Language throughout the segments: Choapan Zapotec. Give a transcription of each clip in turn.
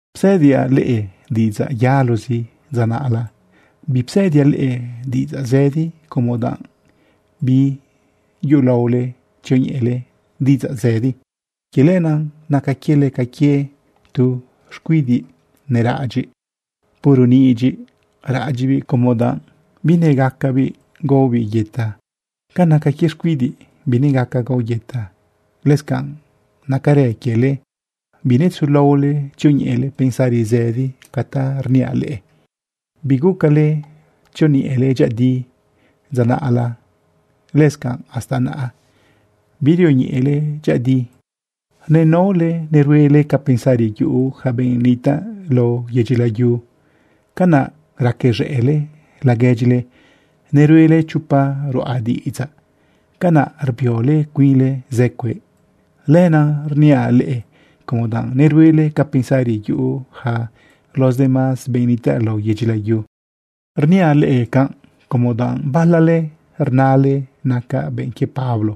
Psëdiaꞌ leꞌe diꞌidzaꞌ yalozi dza naꞌla. Bipsëdiaꞌ leꞌe diꞌidzaꞌ zëdi como danꞌ biyulaole tzioñeꞌele diꞌidzaꞌ zëdi. Quie lenaꞌ naca quiele ca quie tu xcuidiꞌ neraꞌadyiꞌ. Puro nidyiꞌ raꞌadyiꞌbiꞌ como danꞌ binegacabiꞌ gaobiꞌ yëta. Ca naca quie xcuidiꞌ binegaca gao yëta, lëscanꞌ nacarë quiele, binetzulaole tzioñeꞌele pensari zëdi ca ta rniaꞌ leꞌe. Bigucale tzioñeꞌele dyëꞌëdi dza naꞌla, lëscanꞌ hasta naꞌa birioñeꞌele dyëꞌëdi. Nenaole neruele ca pensari yuꞌu yaca benꞌ nitaꞌ lao yedyi layu, canaꞌ racaz̃ëꞌle laguedyile. Neruele chopa ruꞌa diꞌidzaꞌ, canaꞌ rbiole cuinle zë cueꞌ. Lenaꞌ rniaꞌ leꞌe como danꞌ neruele ca pensari yuꞌu yaca los demás benꞌ nitaꞌ lao yedyi layu. Rniaꞌ leꞌe canꞌ, como danꞌ balale rnale: “Nacaꞌ benꞌ quie Pablo.”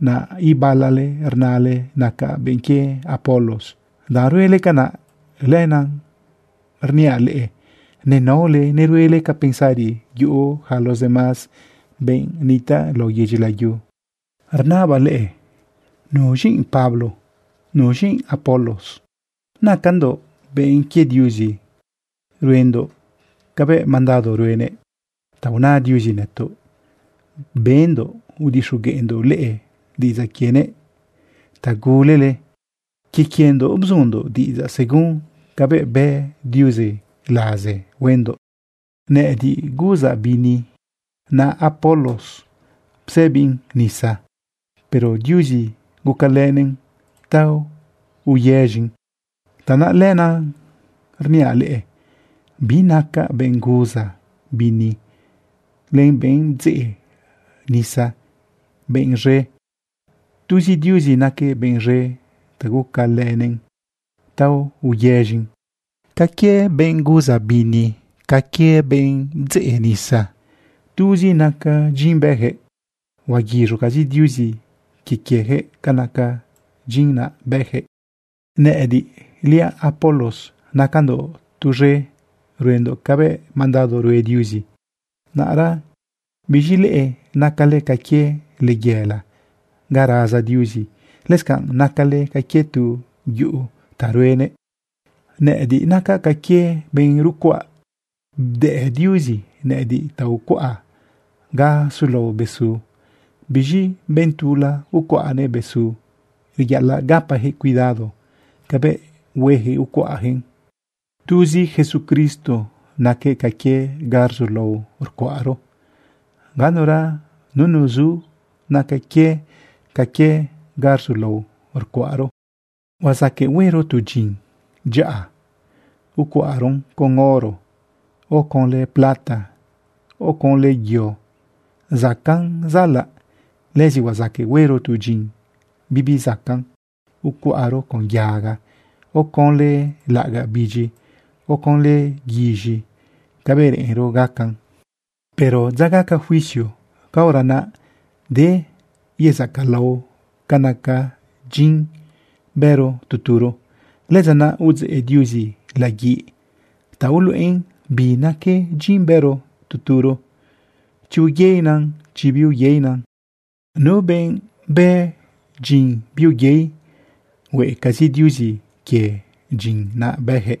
Naꞌ ibalale rnale: “Nacaꞌ benꞌ quie Apolos.” Danꞌ ruele canaꞌ, lenaꞌ rniaꞌ leꞌe nenaole neruele ca pensari yuꞌu yaca los demás benꞌ nitaꞌ lao yedyi layu. Rnabaꞌ leꞌe: ¿Nuz̃i Pablo? ¿Nuz̃i Apolos? Nacandoꞌ benꞌ quie Diuzi ruendoꞌ cabëꞌ mandado ruenëꞌ. Ta una Diuzi nëtoꞌ bëndoꞌ udixogueꞌndoꞌ leꞌe diꞌidzaꞌ quienëꞌ ta gulele. Quie quiendoꞌ bzundoꞌ diꞌidzaꞌ según cabëꞌ bëꞌ Diuzi laze huendoꞌ. Nëꞌëdiꞌ guzaꞌ bini. Naꞌ Apolos bdzeꞌbiꞌn nisa, pero Diuzi gucalënëꞌn ta uyez̃in. Tanaꞌ lenaꞌ rniaꞌ leꞌe, binaca benꞌ guza bini len benꞌ bdzeꞌ nisa benꞌ z̃e. Tuzi Diuzi naquëꞌ benꞌ z̃e ta gucalënëꞌn ta uyez̃in. Ca quie benꞌ guza bini, ca quie benꞌ bdzeꞌ nisa, tuzi naca dyin bëyaquëꞌ. Huaguiz̃ucazi Diuzi quie quieyaquëꞌ ca naca dyin naꞌ bëyaquëꞌ. Nëꞌëdiꞌliaꞌ Apolos nacandoꞌ tuz̃e ruendoꞌ cabëꞌ mandado rue Diuzi. Naꞌra biz̃i leꞌe nacale ca quie layela ga raza Diuzi. Lëscanꞌ nacale ca quie tu yuꞌu ta ruenëꞌ. Nëꞌëdiꞌ nacaꞌ ca quie benꞌ rucuaꞌ. Bdëꞌ Diuzi nëꞌëdiꞌ ta ucuaꞌa ga sulao besu. Biz̃i benꞌ tula ucuaꞌnëꞌ besu. Reyaꞌalaꞌ gapajëꞌ cuidado cabëꞌ huejëꞌ ucuaꞌjëꞌn. Tuzi Jesucristo naquëꞌ ca quie ga rzulao rcuaꞌro. Ganura nunu zu naca quie ca quie ga rzulao rcuaꞌro. Huazaqueꞌ huero tu dyin dyaꞌa ucuaꞌro con oro, o conlë plata, o conlë yo zacaꞌn zaꞌalaꞌ. Lëzi huazaqueꞌ huero tu dyin bibi zacaꞌn ucuaꞌro con yaga, o conlë laꞌagaꞌ bidyi, o conlë guiz̃i cabëꞌ reꞌenro gacan. Pero dza gaca juicio, caora naꞌ de yezacalao ca naca dyin bëro tu turo. Lëdza naꞌ udzeꞌ Diuzi laguiꞌ ta uluꞌen bi naque dyin bëro tu turo, chi uyeinan, chi biuyeinan. Nu benꞌ bë dyin biuyei, hueꞌcazi Diuzi quie dyin naꞌ bëyaquëꞌ.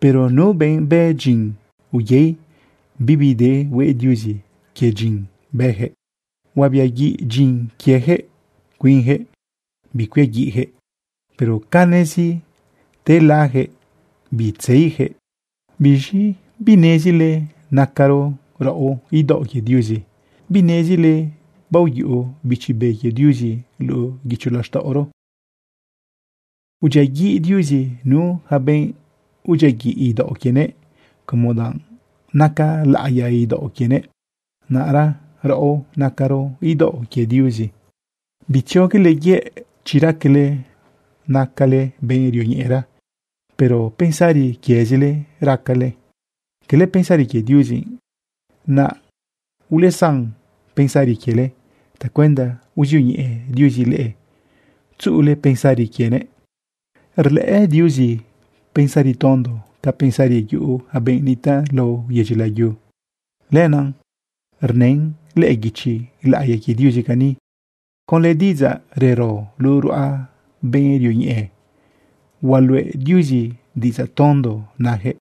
Pero nu benꞌ bë dyin uyei, bibi de hueꞌ Diuzi quie dyin naꞌ bëyaquëꞌ, huabiaguiꞌ dyin quieyaquëꞌ. Cuinyaquëꞌ bicuiaguiꞌyaquëꞌ, pero canezi telayaquëꞌ bitzeiyaquëꞌ. ¿Biz̃i binezile nacaro raꞌo idaoꞌ quie Diuzi? ¿Binezile baoyuꞌu Bichi Be quie Diuzi luꞌu guicho laxtaꞌoro? Udyiaguiꞌ Diuzi nu yaca benꞌ udyiaguiꞌ idaoꞌ quienëꞌ, como danꞌ naca laꞌiya idaoꞌ quienëꞌ. Naꞌra raꞌo nacaro idaoꞌ quie Diuzi. Bitzioguele yëꞌ. Chi raquele nacale benꞌ rioñeꞌera, pero pensari quiezile raquele, cala pensari quie Diuzi, naꞌ ulesan pensari quiele tacuenda uzioñeꞌe Diuzi leꞌe, tzuꞌule pensari quienëꞌ. Rlëꞌë Diuzi pensari tondo ca pensari yuꞌu yaca benꞌ nitaꞌ lao yedyi layu. Lenaꞌ rnën lëꞌë guichi laꞌiya quie Diuzi cani: “Conlë diꞌidzaꞌ rero luꞌu ruꞌa benꞌ rioñeꞌe, hualuꞌe Diuzi diꞌidzaꞌ tondo nayaquëꞌ.”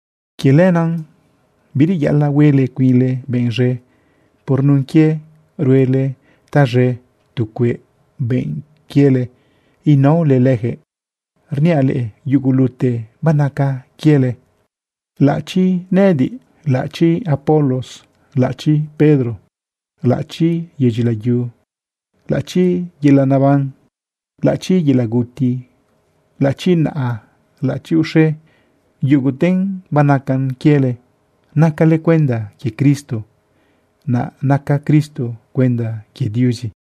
Quie lenaꞌ, bireyaꞌalaꞌ huele cuinle benꞌ z̃e por nun quie ruele taz̃e tu cueꞌ benꞌ quiele inaole leyaquëꞌ. Rniaꞌ leꞌe, yugulute banaca quiele, laꞌachi nëꞌëdiꞌ, laꞌachi Apolos, laꞌachi Pedro, laꞌachi yedyi layu, laꞌachi yelaꞌ naban, laꞌachi yelaꞌ guti, laꞌachi naꞌa, laꞌachi uxe, yuguten banaca quiele. Nacale cuenda quie Cristo, naꞌ naca Cristo cuenda quie Diuzi.